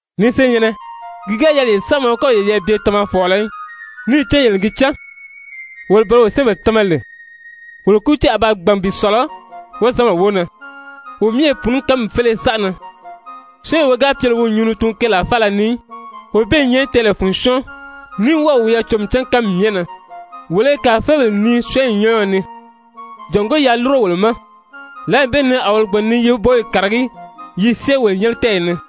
Ni senyɛ̀nnɛ, ki ga yɛlɛ yele saamaw í kɔ́ yeyɛɛ bye tamafɔɔlɔ í, níì cán yele n gi cán, wolo bele wo syɛ́ɛnbèle tama lè, wolo kútiiw a ba gbàn bi sɔ̀lɔ wozanbèle wóo na. Wo myɛ i pùuní kánmi féleye saʔa na. Syɔ́ɔnwee wi ga pye lè wi o nyuu ni tuun keelaa faala ni í, wee bee i nyɛ tɛɛlɛ fun syɔ́ɔn, ní wɔ́ɔ̀ wiyɛɛ cǒmi cán kánmi myɛ na. Wolo i kàrafeebèle nii syɔ́ɔnyi nyɔ́ɔyɔ ni jàngó yaa lúro wolo ma, lǎli bee ni a wolo gbàn ni yi woboyi kàragí yi i syée wolo nyɛ́nɛ tɛ́ɛyi ni.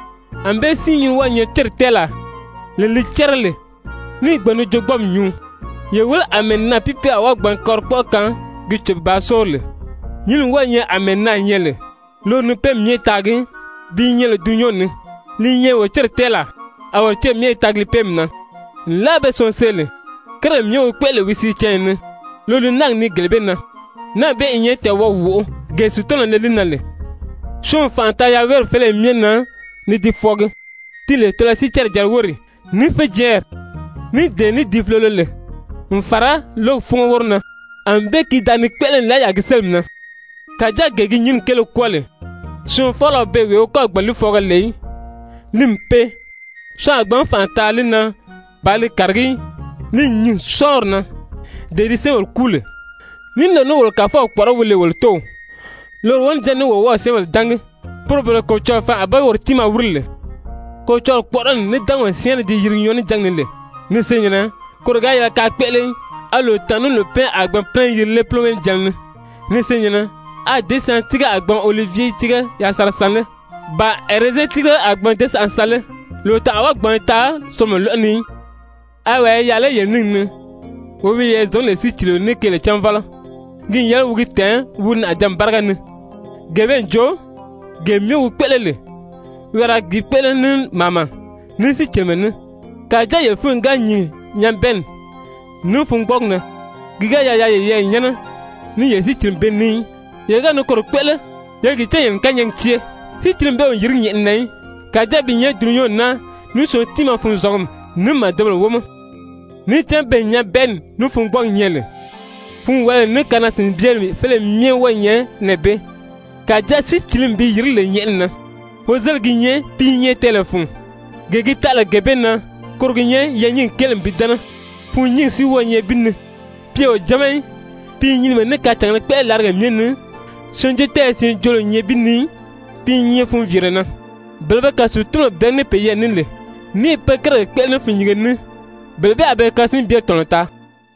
Anbée si nyínni wɔ́ɔ̄ nyɛ céri tɛ́ɛlaa, lee li cɛ́rɛ lè, níì gbàn ni joogbɔɔmi nyuu. Ye wéle àmɛɛ naàpiipiile a wɔ́ɔ gbǎn kɔlikpɔʔɔ kaan gi cò bàā sóori lè! Nyínni wɔ́ɔ i nyɛ àmɛɛ naà nyɛ lè, loro ni péemi myɛ taagi, pi nyɛ lè dulunyanw ni, li i nyɛ wolo céri tɛ́ɛlaa, a wolo céri myɛ i taagi li péemi na, nlaa pe syɔɔn see lè, kérigèle myɛ wi kpéʔele lè wi sìíw canya ni, loro li náagi nii gele bee na, náagi bee i nyɛ tɛɛwɔʔɔgi wóʔo, gee Sutanaw le li na lè. Syɔɔn n fànʔa taa yaweeri féleye myɛ na ni di fwɔɔgi, ti lè tɔlɔyɔ sicɛrɛ-jɛrɛ wóri, ní féjɛɛnri, ní dee ní di fulolo lè, n fàra lǒgi fúngo wóro na, ànbée ki da ni kpéʔele nlaa yaà ki sélimi na. Kàjáa gee gi nyínni kéele kwɔ́ɔ lè, syɔɔn faala o beè wee wi kɔ́ɔ̀ gbàn n li fwɔɔgɔ lè í, li n pee, syɔɔn a gbǎn fànʔa taa li na bàā li kàragí í. Li n nyìn sɔ́ɔnri na, dee di syɛ́ɛnbèle kúu lè. Ní loro ní wolo Kàfɔw kpɔ̀ʔɔrɔ́ wi lè wolo Tóow, loro wonijanni ní wolo wɔ́ɔ̄ syɛ́ɛnbèle dángi, poro bele Kolocɔlɔɔ faan a be woro tiimaa wíri lè. Kolocɔlɔɔ kpɔ̀ʔɔrɔli ní dángaw syɛ́ɛnrɛ di yirigi nyɔɔnijangi ni lè, ni senyɛ̀nnɛ, koro ga yɛlɛ kaa kpéʔele í. A lòtanʔa ní lòpɛnʔɛ a gbǎn pínɛ yiri lé púlowee-níjanna ni? Ni senyɛ̀nnɛ, a děsyaantiige a gbǎn olivye tíige yasanra san lé? Ba ɛrɛzɛn tírige a gbǎn děsyanʔa san lé? Lòtanʔa a wɔ́ɔ gbǎn taa solomɔ lɔ́ʔɔ ni í. A wàa i yaà lé yele níngi ni, wee wi wiyɛɛ zɔ̀ngí lè sícilio ní keele cánvɔlɔ? Ki n yɛlɛ wi gi tɛ̀ɛn wi nàʔajǎnmi báriga ni, gee bee n jo, gee myɛ wi kpéʔele lè, wi a ra gi kpéʔele ní màama, ní sícilimɛ ní. Kàjáa yele fúnyi ga nyìn nyabɛɛnni ní fungbɔɔgi na, ki ga yɛlɛ yaa yeyɛɛ nyɛ́nɛ ní yele sícilimi bee ní í, yele ga ni koro kpéʔele, ye gi cán yele n kányɛɛgi cée. Sícilimi bee o yìrigí nyɛ̀ʔɛni na í. Kàjáa pi i nyɛ dulunyanw naa, ní syɔɔn tiimaa funzɔngumi, ní màdebèle wómɔ. Níì cán beè nyabɛɛnni ní fungbɔɔgi nyɛ lè, funwaliyi ní kanaa-sìnbyeri féleye myɛ wɔ́ɔ i nyɛ nɛɛ bee. Kàjáa sícilimi bi yìrigí lè nyɛ̀ʔɛni na, wozeligi gi nyɛ pi i nyɛ tɛɛlɛ fun, gee gi taʔa lè gee bee na, koro gi nyɛ yɛɛ̀nyingi kéele n bi dɛ́nɛ, fûnnyingi si wɔ́ɔ i nyɛ bi ni, pi o jáma í, pi i nyinimɛ ní kacàngēle kpéʔele làrigèle myɛ ni, syɛɛnjóotɛɛyɛ siin joolo o nyɛ bi ni í, pi i nyɛ funviire na. Bele be kàsiitunbèle bɛ̀ɛgí ní peyɛɛ ní lè ní i pe kérigèle kpéʔele ní fûnnyinge ní, bele bee a be kasinbyeri tɔ̀nɔ taa.